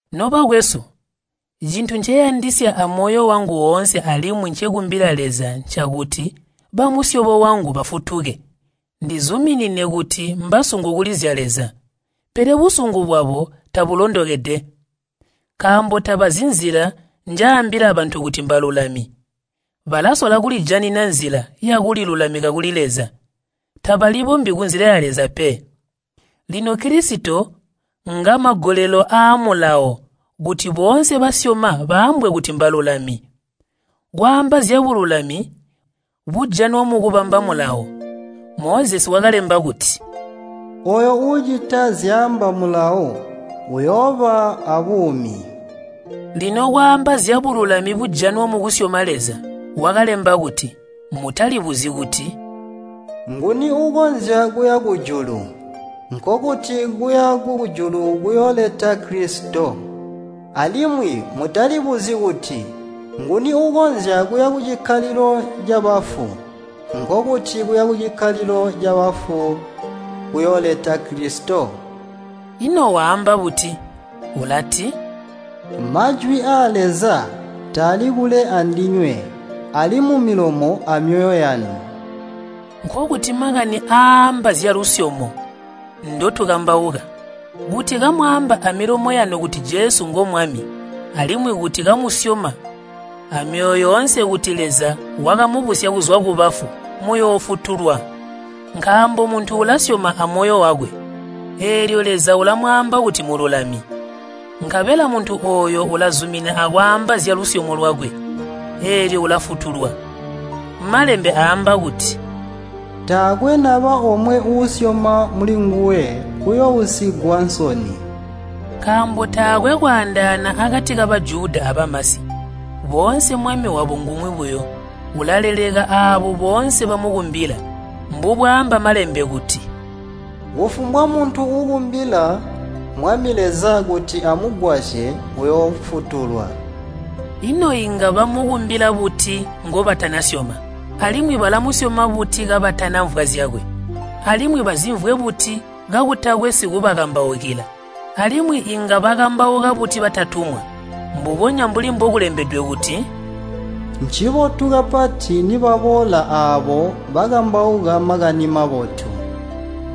Nobakwesu, cintu nceyandisya amoyo wangu woonse alimwi ncekumbila Leza ncakuti bamusyobo wangu bafutuke. Ndizuminine kuti mbasungu kuli zya Leza, pele busungu bwabo tabulondokede. Nkaambo tabazi nzila njaambila bantu kuti mbalulami, balasola kulijanina nzila yakulilulamika kuli Leza, tabalibombyi kunzila ya Leza pe. Lino Kilisito ngamagolelo aa Mulawo kuti boonse basyoma baambwe kuti mbalulami. Kwaamba zyabululami bujanwa mukubamba Mulawo, Mozesi wakalemba kuti, “Ooyo uucita zyaamba Mulawo uyooba aabuumi.” Lino kwaamba zyabululami bujanwa mukusyoma Leza, wakalemba kuti, “Mutalibuzyi kuti, ‘Nguni uukonzya kuya kujulu?’” (Nkokuti, kuya kujulu kuyooleta Kilisito.) “Alimwi mutalibuzyi kuti, ‘Nguni uukonzya kuya kucikkalilo cabafu?’” (Nkokuti, kuya kucikkalilo cabafu kuyooleta Kilisito.) Ino waamba buti? Ulati, “Majwi aa Leza taali kule andinywe. Ali mumilomo amyoyo yanu.” (Nkokuti makani aaamba zyalusyomo ndotukambauka.) Kuti kamwaamba amilomo yanu kuti Jesu ngo Mwami, alimwi kuti kamusyoma amyoyo yoonse kuti Leza wakamubusya kuzwa kubafu, muyoofutulwa. Nkaambo muntu ulasyoma amoyo wakwe, eelyo Leza ulamwaamba kuti mululami, nkabela muntu ooyo ulazumina akwaamba zyalusyomo lwakwe, eelyo ulafutulwa. Malembe aamba kuti, “Taakwe naba omwe uusyoma mulinguwe uyoousigwa nsoni.” Nkaambo taakwe kwaandaana akati ka Bajuda abamasi. Boonse Mwami wabo ngumwi buyo, ulaleleka aabo boonse bamukumbila. Mbubwaamba Malembe kuti, “Kufumbwa muntu uukumbila Mwami Leza kuti amugwasye, uyoofutulwa.” Ino inga bamukumbila buti ngobatanasyoma? Alimwi balamusyoma buti kabatanamvwa zyakwe? Alimwi bazimvwe buti kakutakwe sikubakambaukila? Alimwi inga bakambauka buti batatumwa? Mbubonya mbuli mbokulembedwe kuti, “Ncibotu kapati nibaboola aabo bakambauka Makani Mabotu.”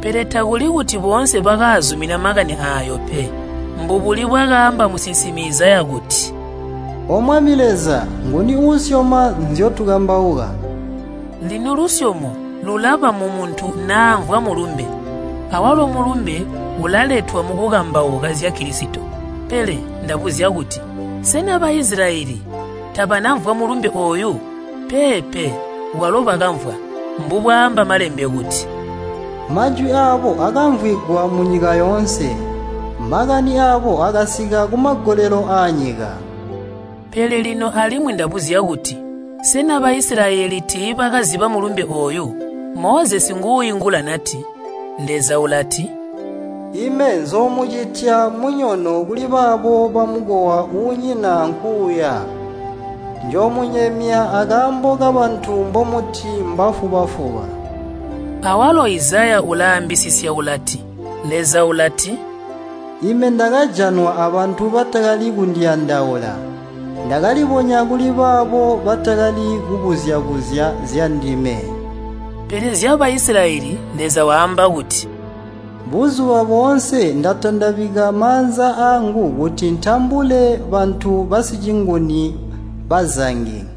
Pele takuli kuti boonse bakaazumina Makani aayo pe. Mbubuli bwakaamba musinsimi Izaya kuti, “O Mwami Leza, nguni uusyoma nzyotukambauka?” Lino lusyomo lulaba mumuntu namvwa Mulumbe, awalo Mulumbe ulaletwa mukukambauka zya Kilisito. Pele ndabuzya kuti, sena Baisilayeli tabanamvwa Mulumbe ooyu? Peepe, kwalo bakamvwa. Mbubwaamba Malembe kuti, “Majwi aabo akamvwigwa munyika yoonse. Makani aabo akasika kumagolelo aanyika.” Pele lino alimwi ndabuzya kuti, sena Baisilayeli tiibakaziba Mulumbe ooyu? Mozesi nguuingula nati, Leza ulati, “Ime nzoomucitya munyono kulibaabo bamukowa uunyina ankuuya. Njoomunyemya akaambo kabantu mbomuti mbafuba-fuba.” Awalo, Izaya ulaambisisya ulati, Leza ulati, “Ime ndakajanwa abantu batakali kundiyandaula. Ndakalibonya kuli baabo batakali kubuzya-buzya zyandime.” Pele zya Baisilayeli Leza waamba kuti, “Buzuba boonse ndatandabika maanza aangu kuti ntambule bantu basicinguni bazangi.”